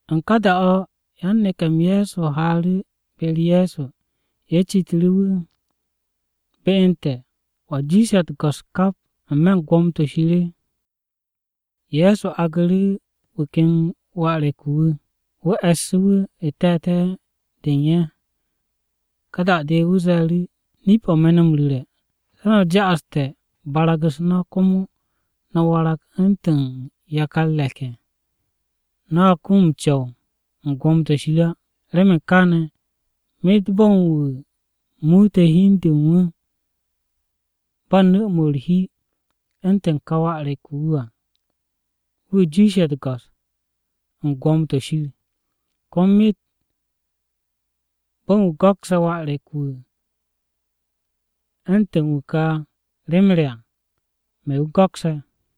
U̱n ká da-o̱ yan-neke̱-m Ye̱so haaru̱ be-u̱r Ye̱so, ye̱ citu̱ru̱ wu̱, “¿Be u̱n te̱, wa jiishe̱ u̱t-go̱s kap n-me̱ u̱n gwo̱mo-to̱ Shir?” Ye̱so agnu̱ru̱ wu̱ ken wà re̱k-wu̱ wu̱, wu̱ e̱ssu̱ wu̱ n-te̱te̱ de u̱n ye̱. Ka da-de wu̱ ze̱e̱ru̱, “Nip-o̱ me̱ no̱ m-ru̱re̱, se̱ no̱ ja'aste̱ barag-u̱s no̱ komo no̱ warag u̱ntu̱n yakar re̱k-ye̱, no̱a kum m-co̱w u̱n gwo̱mo-to̱ Shir á, Remen kaane̱ myet bo̱n wu̱ muute̱ hi u̱n de u̱n wu̱ ba nu̱-mo̱ u̱r-hi u̱ntu̱n ka wà re̱k-wu̱ wu̱ à, wu̱ jiishe̱ u̱t-go̱s u̱n gwo̱mo-to̱ Shir. “Komo myet bo̱n wu̱ go̱kse̱ wà re̱k-wu̱ u̱ntu̱n wu̱ ka rem re à, me̱ wu̱ go̱kse̱.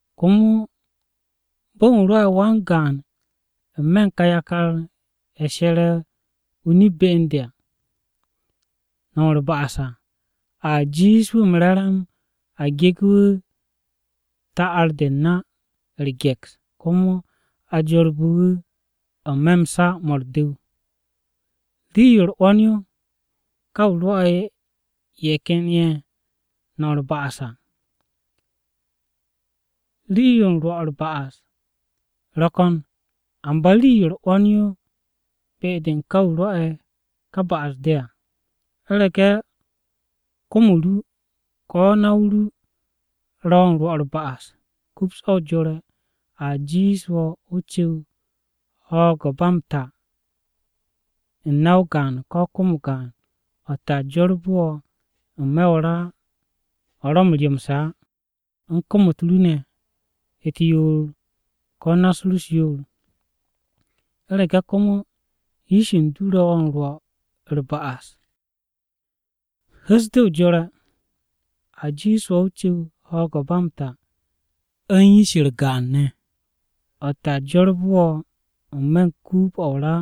“Komo bo̱n wu̱ rwo̱'e̱ wan-gaan n-me̱ u̱n ka yakar-ye̱ she̱re̱ o-nip be u̱n de à, no̱m u̱r-ba'as à, a jiish wu̱ m-re̱re̱m a gege̱ wu̱ ta'ar-de u̱r-na u̱r-ge̱ks, komo a jorbe̱ wu̱ n-me̱ m-sa mo̱ u̱r-du̱w. “Rii-yo u̱r-'wo̱n yo ka wu̱ rwo̱'e̱ ye̱ ken ye̱ no̱m u̱r-ba'as à. Rii-yo u̱n rwo̱ u̱r-ba'as ro̱ ko̱n, amba rii-yo u̱r-'wo̱n yo be-de u̱n ká wu̱ rwo̱'e̱ ka ba'as-de à. U̱rege̱ kom-o ru, ko̱ na-o ru ro̱ wo̱ u̱n rwo̱ u̱r-ba'as, kups o jore̱. A jiish wo̱ o cu̱w ho̱o̱g-o̱ ba m-ta u̱n na-o gaan ko̱ kom-o gaan, o̱tte̱ a jorbe̱ wo̱ n-me̱ o-ra o̱ ro̱ m-ryomse̱ á, u̱n kom-u̱t ru ne̱ u̱t-yoor ko̱ na-u̱s ru u̱s-yoor. U̱rege̱ komo yish u̱n du ro̱ wo̱ m-rwo̱ m-no̱m u̱r-ba'as, hu̱s de o jore̱. A jiish wo̱ o cu̱w ho̱o̱g-o̱ ba m-ta u̱n yish-u̱r gaan ne̱, o̱tte̱ a jorbe̱ wo̱ n-me̱ den-o̱ o-ra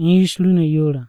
u̱n yish ru ne̱ yoor.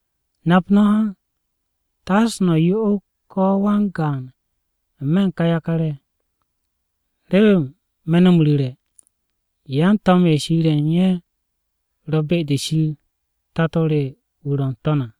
“Nap no̱ ha, taase no̱ yo'og ko̱ wan-gaan n-me̱ u̱n ká yakar-ye̱, remen me̱ no̱ m-ru̱re̱, yan-to̱m-ye̱ Shir ye̱ u̱n ye̱ ro̱ be-de Shir Tato re wu̱ ro̱ n-To̱n à.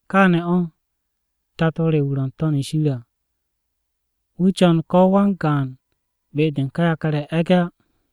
Káane̱ o̱, Tato re wu̱ ro̱ n-To̱n shir à, wu̱ co̱n ko̱ wan-gaan be-de u̱n ká yakar-ye̱ e̱ge̱ á.”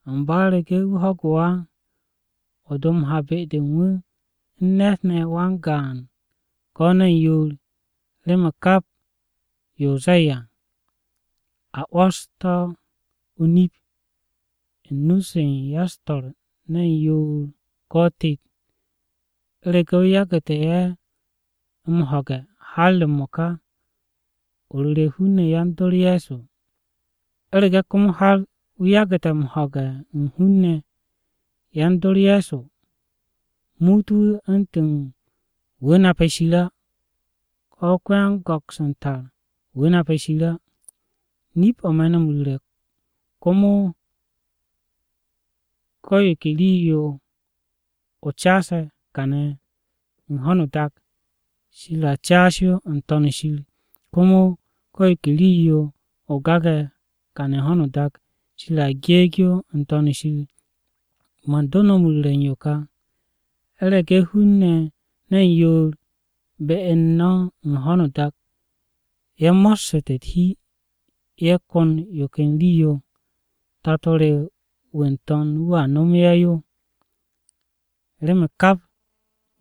Amba u̱rege̱ wu̱ ho̱gu̱ wo̱ á, o do m-ha be-de u̱n wu̱ u̱n ne̱t ne̱ wan-gaan ko̱ ne̱n yoor, remen kap yo o ze̱e̱ à, a 'wo̱s to̱ o-nip u̱n nu-se u̱n ya-u̱s-to̱r ne̱n yoor ko̱ tet. U̱rege̱ wu̱ yagu̱tu̱ ye̱ m-ho̱ge̱ har m-mo̱ka, o ru̱re̱ hun-ne̱ yan-dor Ye̱so. U̱rege̱ komo har wu̱ yagu̱te̱ m-ho̱ge̱ u̱n hun-ne̱ yan-dor Ye̱so, muut wu̱ u̱ntu̱n wu̱ nape̱ Shir á, ko̱ ko-yan-go̱ks u̱n tar wu̱ nape̱ Shir á. “Nip-o̱ me̱ no̱ m-ru̱re̱, komo ko̱ yo ke rii-yo o caase̱ kane̱ u̱n ho̱no o-dak, Shir a caas yo n-To̱n shir. Komo ko̱ yo ke rii-yo o gage̱ kane̱ u̱n ho̱no o-dak, Shir a geeg yo n-To̱n shir. “Man do no̱ m-ru̱re̱ u̱n yo ka, u̱rege̱ hun-ne̱ ne̱n yoor be u̱n no̱ u̱n ho̱no o-dak ye̱ mossu̱te̱ u̱t-hi ye̱ ko̱n yo ken rii-yo, Tato re wu̱ n-To̱n wu̱a nomo ye̱ yo. Remen kap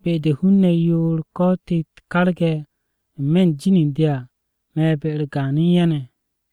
be-de hun-ne̱ yoor ko̱ tet karge̱ n-me̱ u̱n jin u̱n de à, me̱ be-u̱r gaan u̱n ye̱ ne̱.”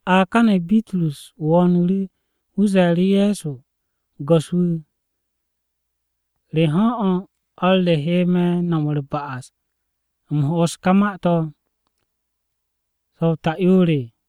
A kane̱ Bitrus wo̱o̱nu̱ru̱, wu̱ ze̱e̱ru̱ Ye̱so, “¿Go̱s-wu̱, re ho̱n o̱ o̱r re he me̱ no̱m u̱r-ba'as u̱m ho'os ká ma-to̱? ¿So̱ ta'yoor o̱?”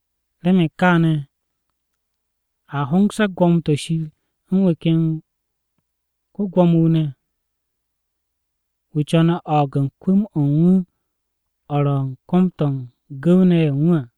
“Remen kaane̱, a hongse̱ gwo̱mo-to̱ Shir u̱n wu̱ ken ko-Gwo̱mo-wu̱ ne̱. Wu̱ co̱ne̱ o̱o̱g u̱n kwu̱m-o̱ u̱n wu̱, o̱ ro̱ u̱n kom-to̱ u̱n gu̱w-ne̱ ye̱ u̱n wu̱ à.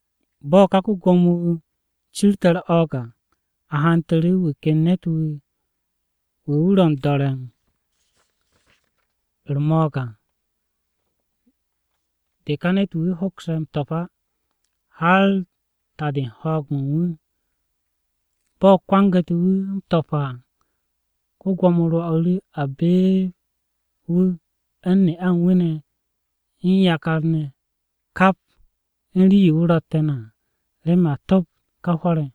Bo̱ ká ko-Gwo̱mo-wu̱ cirte̱ u̱r-o̱o̱g à, a hantu̱ru̱ wu̱ ken ne̱t-wu̱, wu̱, wu̱ ro̱ m-do̱re̱ u̱r-mo̱o̱g à de ka ne̱t-wu̱ a hoks m-to̱p á har ta-de u̱n ho̱o̱g-mo̱ u̱n wu̱. Bo̱ kwangu̱te̱ wu̱ m-to̱p à, ko-Gwo̱mo rwo̱'u̱ru̱ a beeb wu̱ u̱n ne'a u̱n wu̱ ne̱ u̱n yakar-ne̱ kap u̱n rii-yo wu̱ ro̱tte̱ ne̱ à, remen a topt ká hwo̱r-ye̱.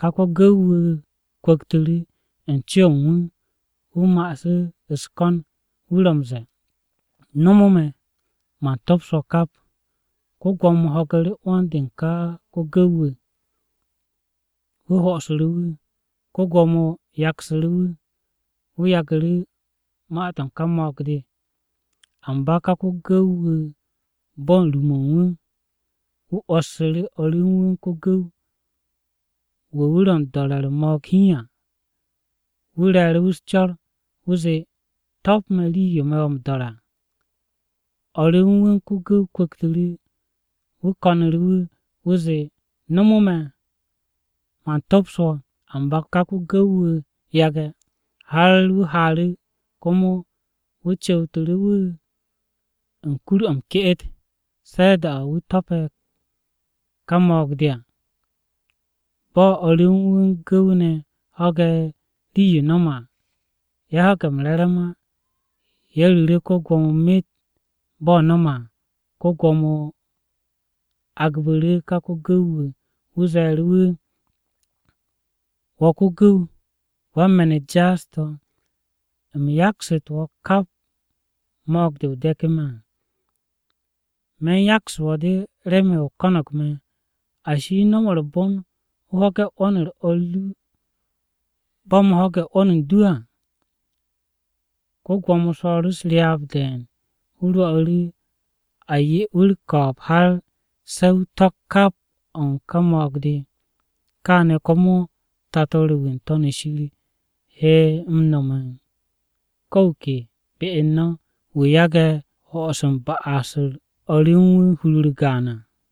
“Ká ko-gu̱w-wu̱ kwu̱ktu̱ru̱ u̱n co-o̱ u̱n wu̱, wu̱ ma'asu̱ u̱s-ko̱n wu̱ ro̱ m-ze̱e̱, ‘Nomo me̱, man tops wo̱ kap.’ Ko-Gwo̱mo ho̱gu̱ru̱ 'wo̱n-de u̱n ká ko-gu̱w-wu̱, wu̱ ho'osu̱ru̱ wu̱. Ko-Gwo̱mo yaksu̱ru̱ wu̱, wu̱ yagu̱ru̱ ma-to̱ u̱n ká mo̱o̱g-de. “Amba ká ko-gu̱w-wu̱ bo̱ u̱n ru-mo̱ u̱n wu̱, wu̱ o̱o̱su̱ru̱ o̱r ru u̱n wu̱ ko-gu̱w, wu̱ wu̱ ro̱ m-do̱re̱ u̱r-mo̱o̱g hiin à, wu̱ re̱e̱ru̱ wu̱ u̱s-co̱r. Wu̱ zee, ‘To̱p me̱ rii-yo me̱ wo̱ m-do̱re̱ à!’ “O̱r ru u̱n wu̱ u̱n ko-gu̱w kwu̱ktu̱ru̱, wu̱ ko̱nu̱ru̱ wu̱. Wu̱ zee, ‘Nomo me̱, man tops wo̱.’ Amba ká ko-gu̱w-wu̱ yage̱, har wu̱ haaru̱, komo wu̱ cu̱wtu̱ru̱ wu̱ u̱n kur-o̱ m-ke'et, se̱ da-o̱ wu̱ to̱pe̱ ká mo̱o̱g-de à. “Bo̱ o̱r re u̱n wu̱ u̱n gu̱w-ne̱ ho̱ge̱ rii-yo no̱me̱ à, ye̱ ho̱ge̱ m-re̱re̱m á. Ye̱ ru̱ru̱ ko-Gwo̱mo myet bo̱ no̱me̱ à. Ko-Gwo̱mo agbu̱ru̱ ká ko-gu̱w-wu̱. Wu̱ ze̱e̱ru̱ wu̱, ‘Wo̱ ko-gu̱w, wan-me̱n-u̱t jaas-to̱, u̱m yaksu̱tu̱ wo̱ kap mo̱o̱g-de o de̱ku̱ me̱ à. Me̱ u̱n yaksu̱ wo̱ de remen o ko̱no̱g me̱. Ashi, ¿no̱m u̱r-bon o ho̱ge̱ 'wo̱n-u̱r o̱r ru bo̱ u̱m ho̱ge̱ 'wo̱n u̱n du á?’ Ko-Gwo̱mo swo̱o̱ru̱ u̱s-ryaab de̱e̱n. Wu̱ rwo̱'u̱ru̱ a 'ye wu̱ u̱r-ko̱o̱b har se̱ wu̱ to̱k kap o̱ u̱n ká mo̱o̱g-de. “Káane̱ komo Tato re wu̱ n-To̱n shir he m-no̱me̱ u̱n ko̱ wu̱ ke be u̱n no̱ wu̱ yage̱ ho'os u̱n ba'as-u̱r o̱r re u̱n wu̱ hur-u̱r gaan à.”